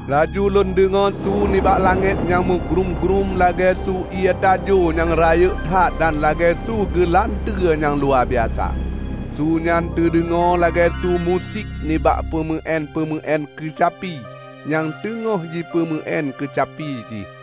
Laju lôn deungoe su nibak langét nyang meugrúm-grúm lagée su ié tajo nyang rayeuk that dan lagée su geulanteue nyang luwabiasa. Su nyan teudeungoe lagée su musik nibak peumeuén-peumeuén keucapi nyang teungoh jipeumeu-én keucapi jih.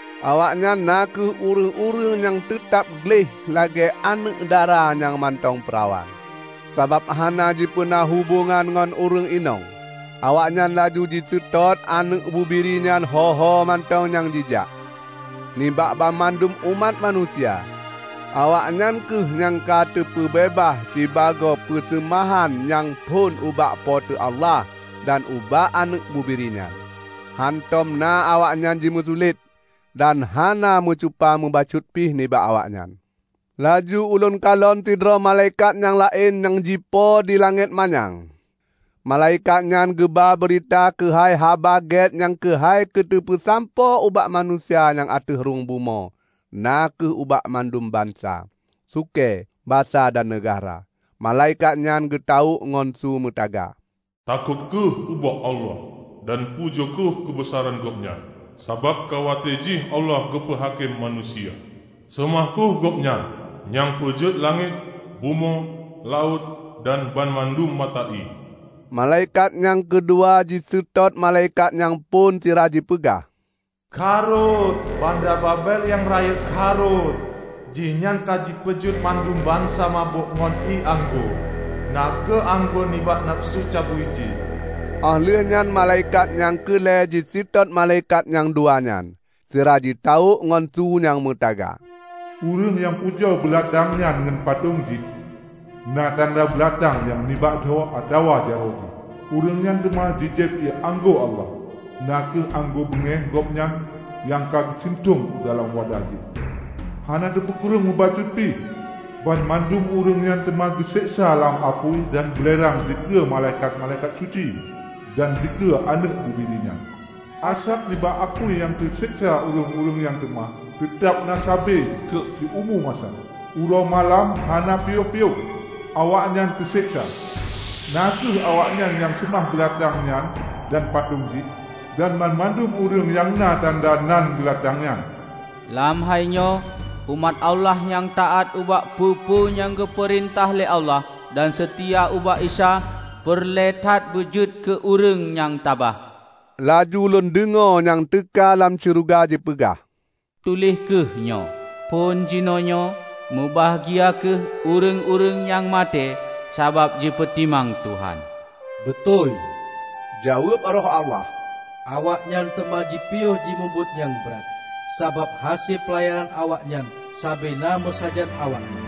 Awaknyan na kheueh ureuëng-ureuëng nyang teutab gleh lagée aneuëk dara nyang mantong peurawan, sabab hana jipeuna hubongan ngon ureuëng inong. Awaknyan laju jiseutôt Aneuëk Bubiri nyan ho-ho mantong nyang jijak. Nibak banmandum umat manusia, awaknyan kheueh nyang ka teupeubeubaih sibagoe peuseumahan nyang phon ubak Po teu Allah dan ubak Aneuëk Bubiri nyan. Hántom na awaknyan jimeusulet; dan hana meucupa meubacut pih nibak awaknyan. Laju ulôn kalon sidroe malaikat nyang laén nyang jipo di langét manyang. Malaikat nyan geuba beurita keuhai Haba Gét nyang keukai keuteupeusampoe ubak manusia nyang ateueh rhueng bumoe na kheueh ubak bandum bansa, sukée, basa dan neugahra. Malaikat nyan geutawök ngon su meutaga, "Takot kheueh ubak Allah, dan pujoe kheueh keubeusaran Gobnyan! Sabab ka watée jih Allah geupeu hakém manusia. Seumah kheueh Gobnyan nyang peujeuet langét, bumoe, laôt dan banmandum mata ié!" Malaikat nyang keudua jiseutôt malaikat nyang phon sira jipeugah, "Ka rhot! Banda Babel nyang rayeuk ka rhot! Jihnyan ka jipeujeuet bandum bansa mabök ngon ié anggô -- na kheueh anggô nibak nafeusu cabui jih!" Óh lheueh nyan malaikat nyang keu lhée jiseutôt malaikat nyang dua nyan, sira jitawök ngon su nyang meutaga, "Ureuëng nyang pujoe beulatang nyan ngon patong jih, na tanda beulatang nyan nibak dho atawa jaroe jih, ureuëng nyan teuma jijieb ié anggô Allah, na kheueh anggô beungéh Gobnyan nyang ka geusintong u dalam wadah jih, hana teupeukureueng meubacut pih! Banmandum ureuëng nyan teuma geuseksa lam apui dan beulerang dikeue malaikat-malaikat suci dan dikeue Aneuëk Bubiri nyan. Asab nibak apui nyang teuseksa ureuëng-ureuëng nyan teuma teutab na sabe keu siumu masa. Uroe malam hana piôh-piôh awaknyan teuseksa, na kheueh awaknyan nyang seumah beulatang nyan dan patong jih, dan banmandum ureuëng nyang na tanda nan beulatang nyan." Lam hainyoe umat Allah nyang taát ubak peue-peue nyang geupeurintah lé Allah dan seutia ubak Isa, peureulée that beujeuet keu ureuëng nyang tabah. Laju lôn deungoe nyang teuka lam syeuruga jipeugah, "Tuléh kheueh nyoe: Phon jinoenyoe, meubahgia kheueh ureuëng-ureuëng nyang maté sabab jipeutimang Tuhan!" "Beutôi!" jaweueb Roh Allah. "Awaknyan teuma jipiôh jimubuet nyang brat, sabab hase peulayanan awaknyan sabe na meusajan awaknyan."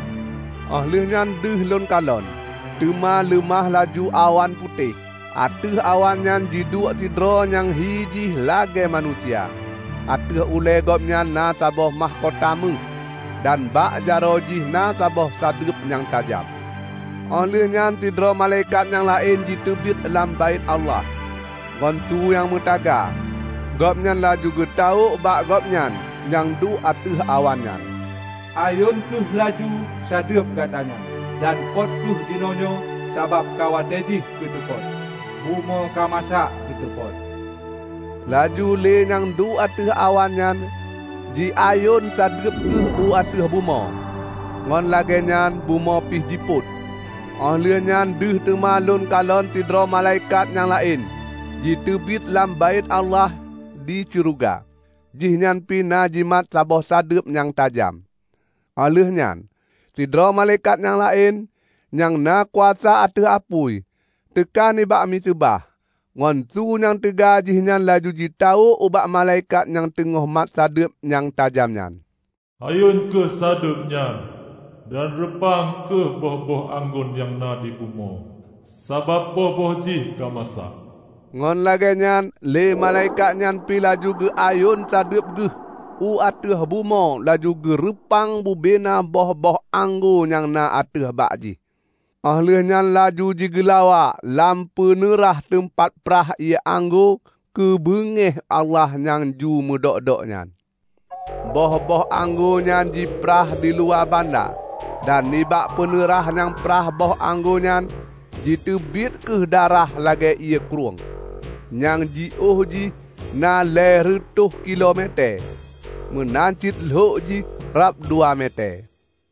Óh lheueh nyan deuh lôn kalon, teuma leumah laju awan putéh. Ateueh awan nyan jiduek sidroe nyang hi jih lagée manusia. Ateueh ulée Gobnyan na saboh mahkota méuh, dan bak jaroe jih na saboh sadeueb nyang tajam. Óh lheueh nyan sidroe malaikat nyang laén jiteubiet lam Baét Allah. Ngon su nyang meutaga. Gobnyan laju geutawök bak Gobnyan nyang duek ateueh awan nyan, "Ayon kheueh laju sadeueb Gata nyan dan pot kheueh jinoenyoe, sabab ka watée jih keu teupot; bumoe ka masak keu teupot!" Laju lé nyang duek ateueh awan nyan jiayon sadeueb Geuh u ateueh bumoe, ngon lagée nyan bumoe pih jipot. Óh lheueh nyan deuh teuma lôn kalon sidroe malaikat nyang laén jiteubiet lam Baét Allah di syeuruga. Jihnyan pih na jimat saboh sadeueb nyang tajam. Óh lheueh nyan, sidroe malaikat nyang laén, nyang na kuasa ateueh apui, teuka nibak miseubah. Ngon su nyang teuga jihnyan laju jitawök ubak malaikat nyang teungoh mat sadeueb nyang tajam nyan, "Ayon kheueh sadeueb nyan dan reupang kheueh boh-boh anggô nyang na di bumoe, sabab boh-boh jih ka masak!" Ngon lagée nyan lé malaikat nyan pi laju geuayon sadeueb geuh u ateueh bumoe laju geureupang bubena boh-boh anggô nyang na ateueh bak jih, óh lheueh nyan laju jigeulawa lam peuneurah teumpat prah ié anggô keubeungéh Allah nyang ju meudok-dok nyan. Boh-boh anggô nyan jiprah diluwa banda, dan nibak peuneurah nyang prah boh anggô nyan jiteubiet kheueh darah lagée ié krueng, nyang jiôh jih na lhée reutôh kilo metée, meunan cit lhok jih rab dua metée.